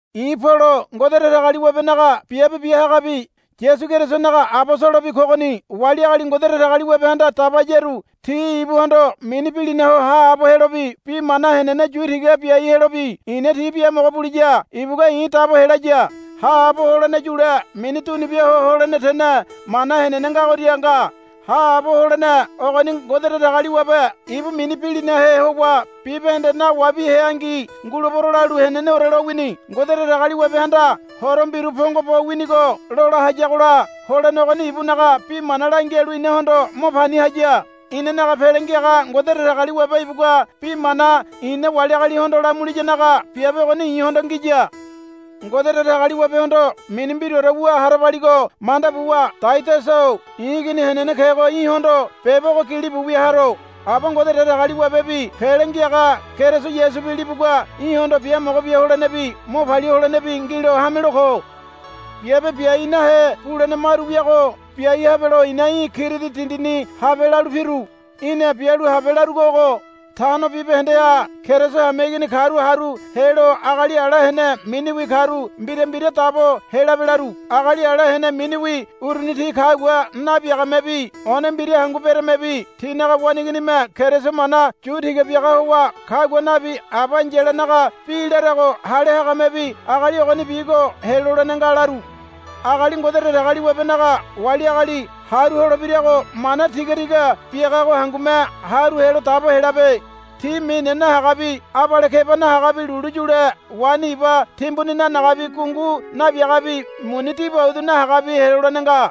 I̱ Polo Ngode Datagaliwabenaga biabe biahagabi Yasu Kerisonaga abosolobi kogoni. Wali agali Ngode Datagaliwabehanda dabayaru ti ibuhondo mini bilina ho haabo helobi bi mana henene yu tiga biai helobi i̱na ti biamogo buliya ibugua i̱ dabo helaya. Haabo holene yule mini dunubia ho holene tene mana henene ngagoria nga. Haabo holene ogoni Ngode Datagaliwabe ibu mini bilinahe howa bibahende nawabi heangi, Ngulebero, lalu heneneore lowini. Ngode Datagaliwabehanda horo mbiru pongo bo winigo lola hayagola holene ogoni ibunaga bi mana langialu inahondo mo pani haya. Inanaga Pele Ngiaga Ngode Datagaliwabe ibugua bi mana i̱na wali agalihondo lamuliyanaga biabe ogoni i̱hondo ngiya. Ngode Datagaliwabehondo mini mbiraore wu harabaligo manda buwa Taidasa-o i̱ igini henene kego i̱hondo beba ogo gilibu wia haro. Aba Ngode Datagaliwabebi Pele Ngiaga Keriso Yasubi libugua í̠hondo biamogo bia holenebi mo palia holenebi ngilo hamelo ko. Biabe biai nahe bulene maru wiago biai habelo i̱na í̠ Kiridi dindini habe lalu piru. Í̠na bialu habe larugo ogo. Tano bibahendeha Keriso hameigini karu haru helo agali ala hene miniwi karu mbira mbira dabo helabe, laru. Agali ala hene miniwi uruni ti kagua nabiagamebi one mbira hangu beremebi tinaga waneiginime Keriso mana yu tiga biaga howa kagua nabi aba ai̱yalanaga bi larago hale hagamebi agali ogonibigo helolene nga, laru. Agali Ngode Datagaliwabenaga wali agali haru holebirago mana tiga tiga biagago hangume haru helo dabo helabe. Ti mine nahagabi abale keba nahagabi lulu yule waini iba timbuni nanagabi gungu nabiagabi muni dibaudu nahagabi helolene nga.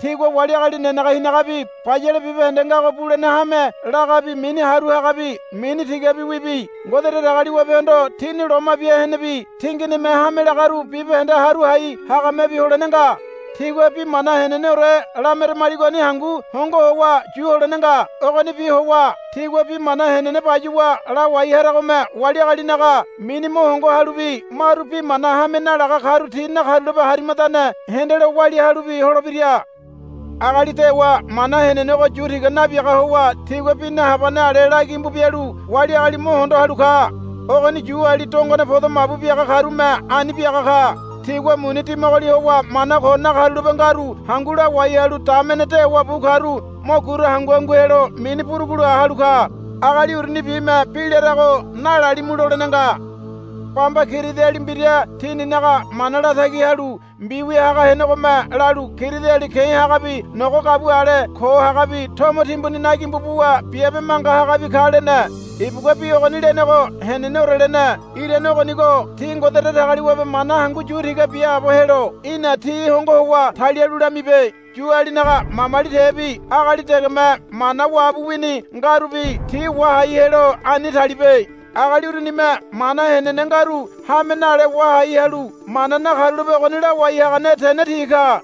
Tigua wali agali nenege hinagabi bayale bibahende ngago bulene hame lagabi mini haru hagabi mini tigabiwibi Ngode Datagaliwabehondo tini loma bia henebi tinginime hame lagaru bibahende haru hai hagamebi holene nga. Tigua bi mana heneneore lameramaligoni hangu hongo howa yu holene nga. Ogonibi howa tigua bi mana henene bayuwa lawai haragome wali agalinaga mini mo hongo halubi maru bi mana hame nalaga karu ti nakarulape harimadane hendelo walia halubi holebira. Agali dewa mana henenego yu tiga nabiaga howa tigua bi nahabane ale la gimbu bialu wali agali mo hondo halu ka. Ogoni Yuali dongone podo mabu biaga karume ani biaga ka. Tigua muni dimagoli howa mana ko nakarulape ngaru hangu lawai halu damene dewa bu karu mo gura hangu hangu helo mini burugula halu ka. Agali urunibime bi larago nalalimu lolene nga. Bamba Kiridiali mbira tininaga mana latagi halu mbiwia haga henegome lalu, Kiridiali ke̱ hagabi nogo gabua ale ko hagabi tomo timbuni nagimbu buwa biabe manga hagabi ka, lene. Ibugua bi ogoni lenego heneneore lene. Irane ogonigo ti Ngode Datagaliwabe mana hangu yu tiga biaabo helo í̠na ti hongo howa talialu lamibe. Yualinaga mamali tebi agali degeme mana wabu wini ngarubi ti wahai helo ani talibe. Agali urunime mana henene ngaru hame nale wahai halu mana nakarulape ogoni lawai hagane tene ti ka.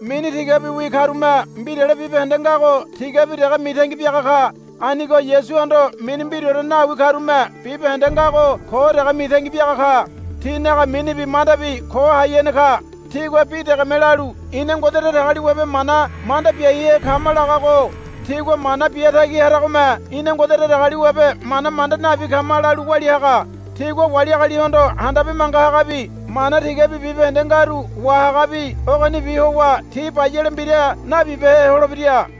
Mini tigabiwi karume mbirale bibahende ngago tigabi dege mitangi biaga ka. Anigo Yasuhondo mini mbiraore nawi karume bibahende ngago ko dege mitangi biaga ka. Tinaga minibi mandabi ko hai hene ka. Tigua bi degeme lalu, Ina Ngode Datagaliwabe mana manda biaihe kama, lagago tigua mana bia tagi haragome, Ina Ngode Datagaliwabe mana manda nabi kama, lalu walia haga. Tigua wali agalihondo handabe manga hagabi mana tigabi bibahende ngaru wahagabi ogonibi howa ti bayale mbira nabibehe holebira.